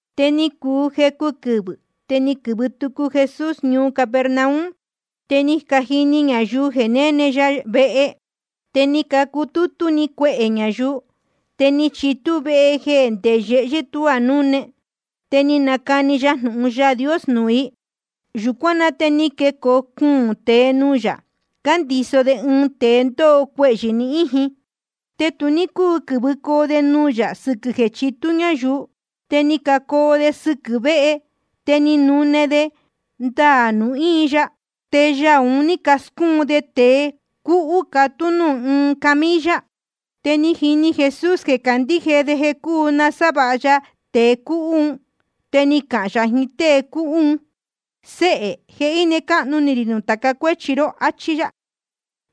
Te ni cuu jecu quɨvɨ̄, te ni quɨ̄vɨ tucu Jesús ñuu Capernaum. Te ni cajini ñayuu jeē néne ya vehe. Te ni cacutútú‑ni cuehē ñayuu, te ni chitú vehe jeē ndé yehyɨ́ tuá núne. Te ni nacani ya jnūhun Yaā Dios nuū i. Yūcuán na te ni quecoo cuūn tēe nuū yā, cándiso de ɨɨn tēe ndóho cuehyɨ̄ ni íjin. Te tu ní cúu quɨ̄vɨcoo de nuū yā sɨquɨ̄ jeē chitú ñáyuu. Te ni cacoo de sɨquɨ̄ véhe, te ni canune de ndaā nuū íin ya, te yaū un ní cascúun de tēe cúhú, cátú de nuū ɨɨn camilla. Te ni jini Jesús jeē cácandíje de jeē cúu nasávāha ya tēe cúhú un. Te ni cahān yā jiín tée cúhú un: Séhē, je íne cáhnu ni rī nuū tāca cuéchi ró, áchí yá.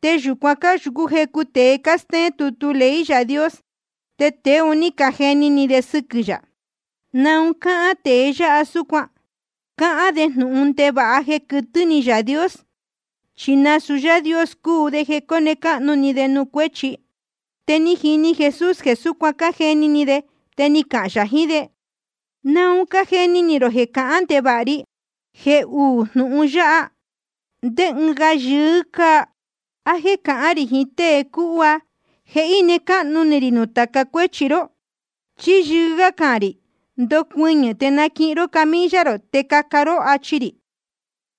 Te yūcuan cáyūcú jecu tēe cástéén tutu ley Yaā Dios, te tēe un ní cajeni ni de sɨquɨ̄ yā: ¿Naun cáhán tēe yáha súcuan? Cáhán de jnūhun ndevāha jeē quɨtɨ́ ni Yaā Dios, chi nasūu Yáā Dios cúu de jeē cóne cáhnu ni de nuū cuéchi. Te ni jini Jesús jeē súcuan cájeni ni de, te ni cahān yā jiín de: ¿Naun cájeni ni rō jeē cahán ndevāha ri? Jeē uú jnūhun yáha, ¿ndé ɨɨn yɨɨ́ gá cáa? ¿A jéē cahán rī jiín tée cúhú: Je íne cáhnu ni rī nuū tāca cuéchi ró? ¿Chí yɨɨ́ gá jeē cahān rī: Ndocuɨñɨ̄ te naquihin ró camilla rō, te caca ró, achi rī?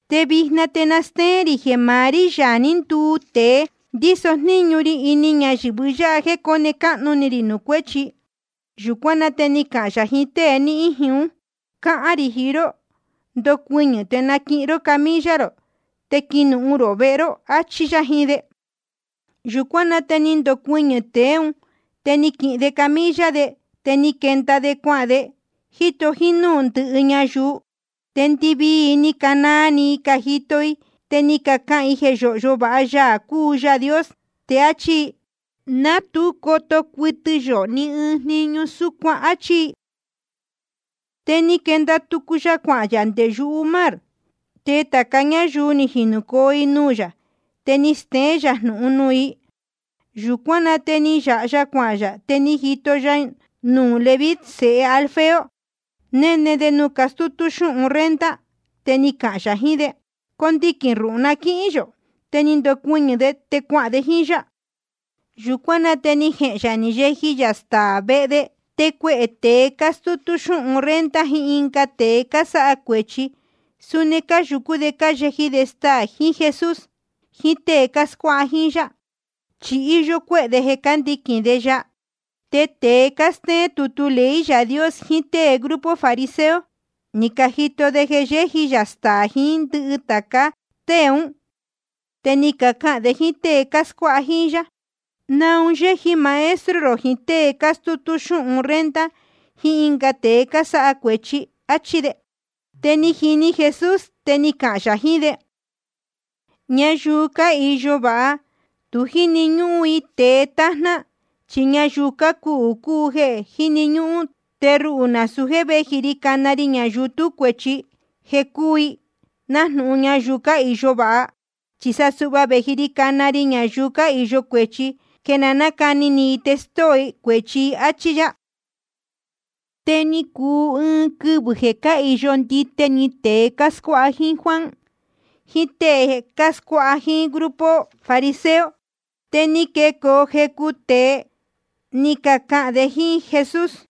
Te vijna te na stéén rī jeē maá rí, Yaā ní nduu tēe, ndíso jníñu ri ini ñayɨ̄vɨ yáha jéē cóne cáhnu ni rī nuū cuéchi. Yūcuán na te ni cahān yā jiín tée ni íjin ún: Cáhán rī jiín ró, ndocuɨñɨ̄ te naquihin ró camilla rō, te quinuhun rō vehe ró, áchí yá jiín de. Yūcuán na te ni ndocuɨñɨ̄‑ni tēe ún, te ni naquihin de camilla de, te ni quenda de cuahān de, jíto jínúū ndɨhɨ ñayuu. Te ndɨvii i ni canaa ni i cájito i, te ni cacahān i jeē yóhyo vāha Yaā cúu Yaā Dios. Te áchí i: Ná tu coto cuɨtɨ yō ni ɨɨn jniñu súcuan, áchí i. Te ni quenda tucu ya cuahān yā nde yumar. Te tāca ñáyuu ni jinūcoo i nuū yā, te ni steén yā jnūhun nuū i. Yūcuán na te ni yāha ya cuahān yā, te ni jito ya nuū Leví sēhe Alfeo, néne de nuū cutútú xúhun renta. Te ni cahān yā jiín de: Condiquīn ruhū na quíhín yō. Te ni ndocuɨñɨ̄ de, te cuahān de jíín yá. Yūcuán na te ni jehēn yā ni yeji yā staā vehe de. Te cuehē tēe cástútú xúhun renta jiín ɨnga tēe cásáha cuēchi, suni cáyūcú de cáyeji de staā jiín Jesús jiín tée cáscuáha jíín yá, chi íyó cuéhē de jeē cándiquīn de ya. Te tēe cástéén tutu ley Yaā Dios jiín tée grupo fariseo, ni cajito de jeē yéji yā staā jiín ndɨhɨ tāca tée ún. Te ni cacahān de jíín tée cáscuáha jíín yá: ¿Naun yéji maestro rō jiín tée cástútú xúhun renta jiín ɨnga tēe cásáha cuēchi? áchí de. Te ni jini Jesús, te ni cahān yā jiín de: Ñayuu cáhīyo váha, tu jíni ñúhún i tēe tájná, chi ñayuu cácuhū cúu jeē jíni ñúhún. Te ruhū nasūu jéē véji ri cana ri ñayuu tú cuēchi, jeē cúu i nájnūhun ñayuu cáhīyo vāha. Chi sa suhva vēji ri cana ri ñayuu cáhīyo cuéchi, jeē na nácani ni i te stóo i cuēchi i. Áchí yá. Te ni cuu ɨɨn quɨvɨ̄ jeē cáhīyo ndite ni tēe cáscuáha jíín Juan, jiín tée cáscuáha jíín grupo fariseo. Te ni quecoo jecu tēe, ni cacahān de jíín Jesús: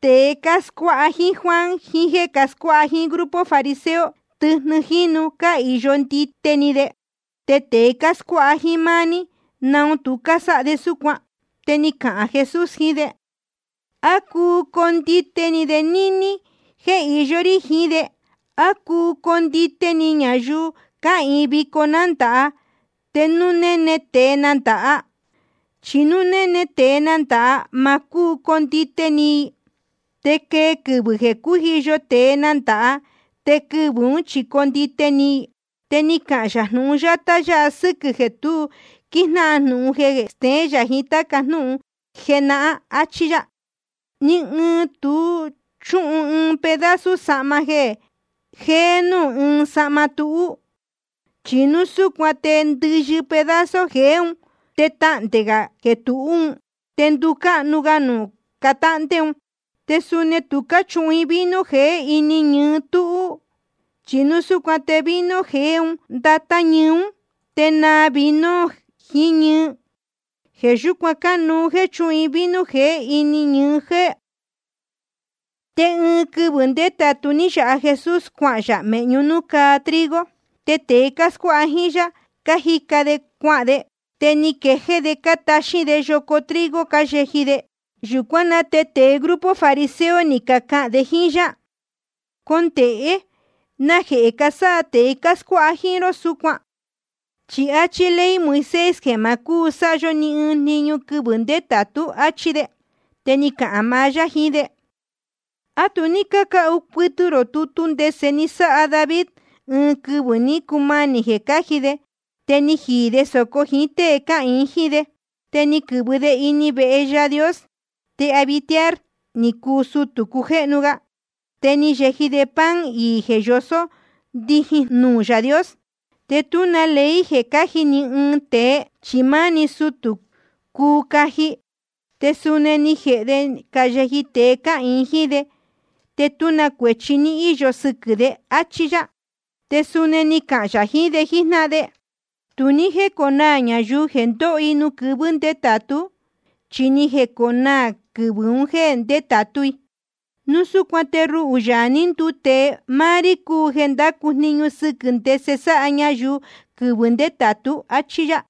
Tēe cáscuáha jíín Juan jiín jéē cascuáha jíín grupo fariseo, tɨjnɨ jínu cáhīyo ndite ni de. Te tēe cáscuáha jíín máá ní, ¿naun tu cásáha de súcuan? Te ni cahān Jesús jiín de: ¿A cuu condite ni de níní jéē iyó rí jiín de? ¿A cuu condite ni ñayuu cáhīin vico nándāha, te núu níní néne tēe nándāha? Chi núu néne tēe nándāha, te ma cúu condite ni i. Te quee quɨvɨ̄ jeē cújiyo tēe nándāha, te quɨvɨ̄ ún chi condite ni i. Te ni cahān yā uū jnūhun yátá sɨ́quɨ̄ jeē tu quíjnáhan jnūhun jeé jéē steén yā jiín táca jnúhun jenahán. Achí yá: Ni ɨɨn tu náchuhun ɨɨn pedazo sahma jéé núū ɨɨn sahma túhú. Chi núu súcuan te ndɨyɨ pedazo jeé un, te tahndē gā jeē tuhú un, te nducáhnu ga nuū cátáhndé un. Te suni tu cáchuhun vino jeé ini ñɨɨ túhú. Chi núu súcuan te vino jeé un ndatá ñɨɨ ún, te naa vino jiín ñɨɨ. Jeē yúcuan cánuú jéē chúhun i vino jeé ini ñɨɨ jéé. Te ɨɨn quɨvɨ̄ ndétātu ní yāha Jesús cuahān yā mēhñú nuū cáa trigo. Te tēe cáscuáha jíín yá, cájica de cuahān de, te ni quejéé de cátaxín de yoco trigo cáyeji de. Yūcuán na te tēe grupo fariseo ni cacahān de jíín yá: Condēhé. ¿Najehē casáha tēe cáscuáha jíín ró súcuan? Chi áchí ley Moisés jeē ma cúu sáha yó ni ɨɨn jniñu quɨvɨ̄ ndétātú. Achí de. Te ni cahān maá yá jiín de: ¿A tu ní cácahu cuɨtɨ rō tutu ndese ni sáha David, ɨɨn quɨvɨ̄ ní cumanī jeē cáji de, te ni jiī de sōco jíín tée cáhīin jíín de? Te ni quɨ̄vɨ de ini vehe Yaā Dios. Te Abiatar ni cuu sutū cujéhnu ga. Te ni yeji de pan iī jeē yosó ndijin nuū Yaā Dios. Te tú na ley jeē cáji ni ɨɨn tēe, chi máá‑ni sutū cuu caji. Te suni ni jēhe de ni cayeji tēe cáhīin jíín de. Te tú na cuēchi ní íyo sɨquɨ̄ de. Achí yá. Te suni ni cahān yā jiín de jíjnáhan de: Tu ní jéconaā ñayuu jeē ndóho i nuū quɨvɨ̄ ndétātú, chi ni jeconaā quɨvɨ̄ un jéē ndétātú i. Núu súcuan te ruhū, Yaā ní nduu tēe, máá rí cúu jeē ndácu jniñu sɨquɨ̄ ndese sáha ñayuu quɨvɨ̄ ndétātú, áchí yá.